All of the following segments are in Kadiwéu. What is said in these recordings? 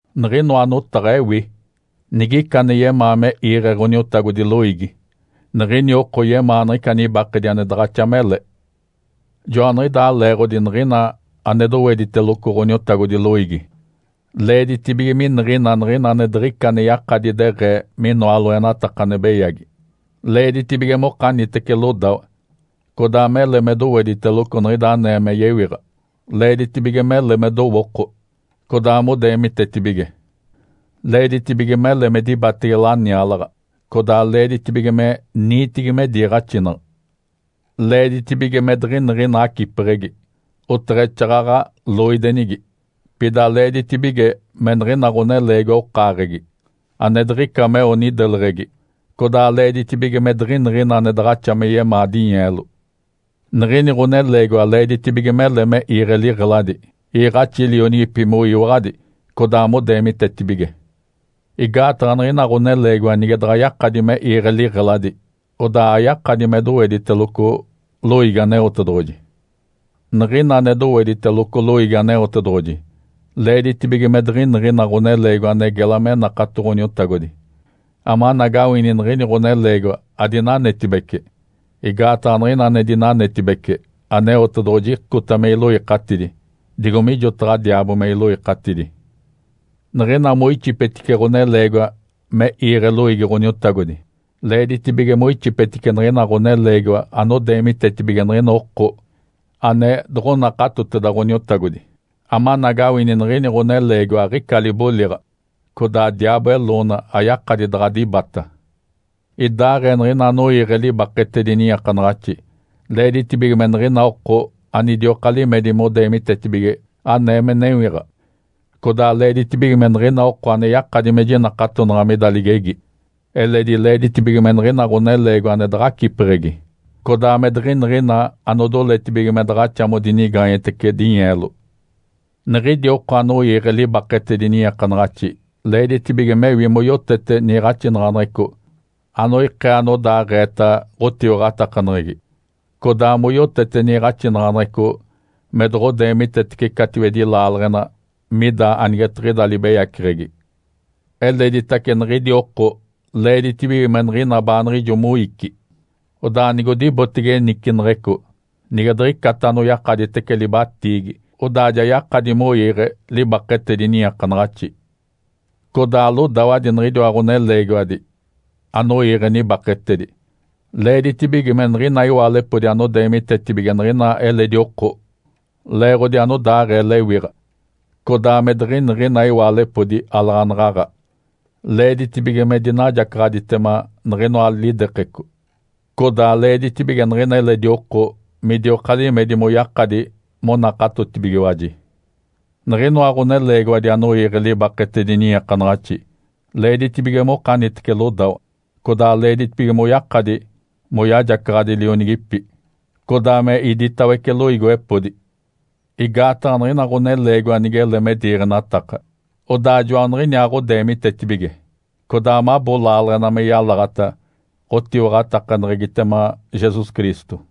Niɡ̶inoa notaɡ̶a ewi. Nigica ane yemaa me iiɡ̶e Ǥoniotagodi loiigi, niɡ̶ini oko yemaa niɡ̶ica nibakedi ane daɡ̶axa mele. Joaniɡ̶idaa leeɡ̶odi niɡ̶ina ane dowediteloco Ǥoniotagodi loiigi leeditibige miniɡ̶ina niɡ̶ina ane diɡ̶ica ane yakadi deɡ̶ee minoa loenataka ane beyagi. Leeditibige mokanitece lodawa, codaa mele me dowediteloco niɡ̶ida anee me yewiɡ̶a, leeditibige mele me dowooko, codaa modeemitetibige. Leeditibige mele me dibatege laniaalaɡ̶a, codaa leeditibige me niitigi me diiɡ̶axinaɡ̶a. Leeditibige me diɡ̶iniɡ̶ina acipeɡ̶egi, oteɡ̶exaaɡ̶aɡ̶a loidenigi. Pida leeditibige me niɡ̶ina ɡ̶oneleegiwa okaaɡ̶egi, ane diɡ̶ica meo nideleɡ̶egi, codaa leeditibige me diɡ̶iniɡ̶ina ane daɡ̶axa me yemaa dinyeelo. Niɡ̶ini ɡ̶oneleegiwa leeditibige mele me iiɡ̶e liɡ̶eladi, iiɡ̶axi lionigipi moyiwaɡ̶adi, codaa modeemitetibige. Igaataɡ̶a niɡ̶ina ɡ̶oneleegiwa nige daɡ̶a yakadi me iiɡ̶e liɡ̶eladi, odaa ayakadi me dowediteloco loiigi Aneotedoɡ̶oji. Niɡ̶ina ane dowediteloco loiigi Aneotedoɡ̶oji, leeditibige me diɡ̶iniɡ̶ina ɡ̶oneleegiwa ane gela me nakato Ǥoniotagodi, amanagawini niɡ̶ini ɡ̶oneleegiwa adinanetibece. Igaataɡ̶a niɡ̶ina ane dinanetibece, Aneotedoɡ̶oji icota me iloikatidi digo mijotaɡ̶a diaabo me iloikatidi. Niɡ̶ina moixipetice ɡ̶oneleegiwa me iiɡ̶e loiigi Ǥoniotagodi, leeditibige moixipetice niɡ̶ina ɡ̶oneleegiwa anodeemitetibige niɡ̶ina oko ane doɡ̶onakatoteda Ǥoniotagodi, amanagawini niɡ̶ini ɡ̶oneleegiwa aɡ̶ica liboliɡ̶a, codaa diaabo eloona ayakadi daɡ̶a dibata. Idaaɡ̶ee niɡ̶ina anoiiɡ̶e libaketedi niiakanaɡ̶axi, leeditibige me niɡ̶ina oko anidioka limedi modeemitetibige anee me newiɡ̶a, codaa leeditibige me niɡ̶ina oko ane yakadi me jinakatonaɡ̶a mida ligegi. Eledi leeditibige me niɡ̶ina ɡ̶oneleegiwa ane daɡ̶acipeɡ̶egi, codaa me diɡ̶iniɡ̶ina anodoletibige me daɡ̶axa modinigaanyetece dinyeelo. Niɡ̶idi oko anoiiɡ̶e libaketedi niiakanaɡ̶axi leeditibige mewi moyotete niiɡ̶axinaɡ̶aneɡ̶eco anoikee anodaaɡ̶eeta ɡ̶otiwaɡ̶atakaneɡ̶egi, codaa moyotete niiɡ̶axinaɡ̶aneɡ̶eco me doɡ̶odeemitetece catiwedi laaleɡ̶ena mida anigetiɡ̶ida libeyaceɡ̶egi. Eleditace niɡ̶idi oko leeditibige me niɡ̶ina baaniɡ̶ijo moici. Odaa nigodibotege niciniɡ̶ico, nige diɡ̶icata anoyakaditece libatiigi, odaa ja yakadi moiiɡ̶e libaketedi niiakanaɡ̶axi. Codaa lodawadi niɡ̶idiwa ɡ̶oneleegiwadi anoiiɡ̶e nibakedi, leeditibige me niɡ̶ina iwaalepodi anodeemitetibige niɡ̶ina eledi oko leeɡ̶odi anodaaɡ̶ee lewiɡ̶a, codaa me diɡ̶iniɡ̶ina iwaalepodi alaɡ̶anaɡ̶aɡ̶a. Leeditibige me dinajacaɡ̶aditema niɡ̶inoa lidekeco, codaa leeditibige niɡ̶ina eledi oko midioka limedi moyakadi monakatotibigiwaji. Niɡ̶inoa ɡ̶oneleegiwadi anoiiɡ̶e libaketedi niiakanaɡ̶axi, leeditibige mokanitece lodawa, codaa leeditibige moyakadi moyajacaɡ̶adi lionigipi, codaa me iditawece loiigiwepodi. Igaataɡ̶a niɡ̶ina ɡ̶oneleegiwa nigele me diiɡ̶enataka, odaa joaniɡ̶iniaaɡ̶odeemitetibige, codaa mabo laaleɡ̶ena me yalaɡ̶ata ɡ̶otiwaɡ̶atakaneɡ̶egitema Jesus Cristo.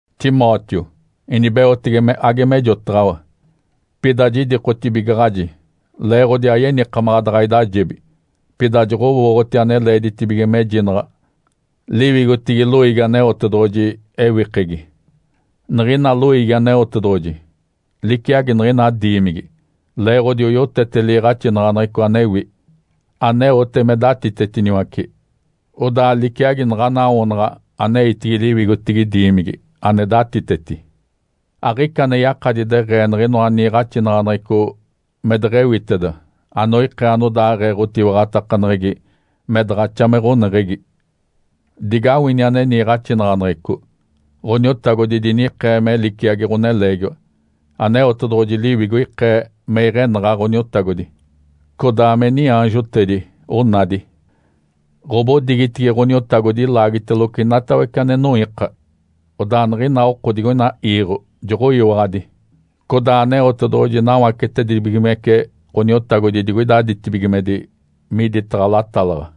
Timóteo, inibeotege me age mejotaɡ̶awa. Pida jidikotibigaɡ̶aji leeɡ̶odi ayenikamaɡ̶a daɡ̶a idajebi, pida joɡ̶owooɡ̶oti ane leeditibige mejinaɡ̶a liwigotigi loiigi Aneotedoɡ̶oji ewikegi. Niɡ̶ina loiigi Aneotedoɡ̶oji liciagi niɡ̶ina diimigi, leeɡ̶odi oyotete liiɡ̶axinaɡ̶aneɡ̶eco anewi, aneote me datitetiniwace, odaa liciagi naɡ̶ana awoonaɡ̶a aneitigi liwigotigi diimigi ane datiteti. Aɡ̶ica ane yakadi deɡ̶ee niɡ̶inoa niiɡ̶axinaɡ̶aneɡ̶eco me deɡ̶ewiteda anoikee anodaaɡ̶ee ɡ̶otiwaɡ̶atakaneɡ̶egi me daɡ̶axa me ɡ̶oneɡ̶egi. Digawini ane niiɡ̶axinaɡ̶aneɡ̶eco: Ǥoniotagodi dinikee me liciagi ɡ̶oneleegiwa. Aneotedoɡ̶oji Liwigo ikee me iɡ̶enaɡ̶a Ǥoniotagodi, codaa me niaanjotedi onadi. Ǥobodigitigi Ǥoniotagodi ilaagiteloco inatawece ane noiika, odaa niɡ̶ina oko digoina iiɡ̶o joɡ̶oyiwaɡ̶adi. Codaa Aneotedoɡ̶oji nawacetedibigimece Ǥoniotagodi digoida ditibigimedi miditaɡ̶a latalaɡ̶a.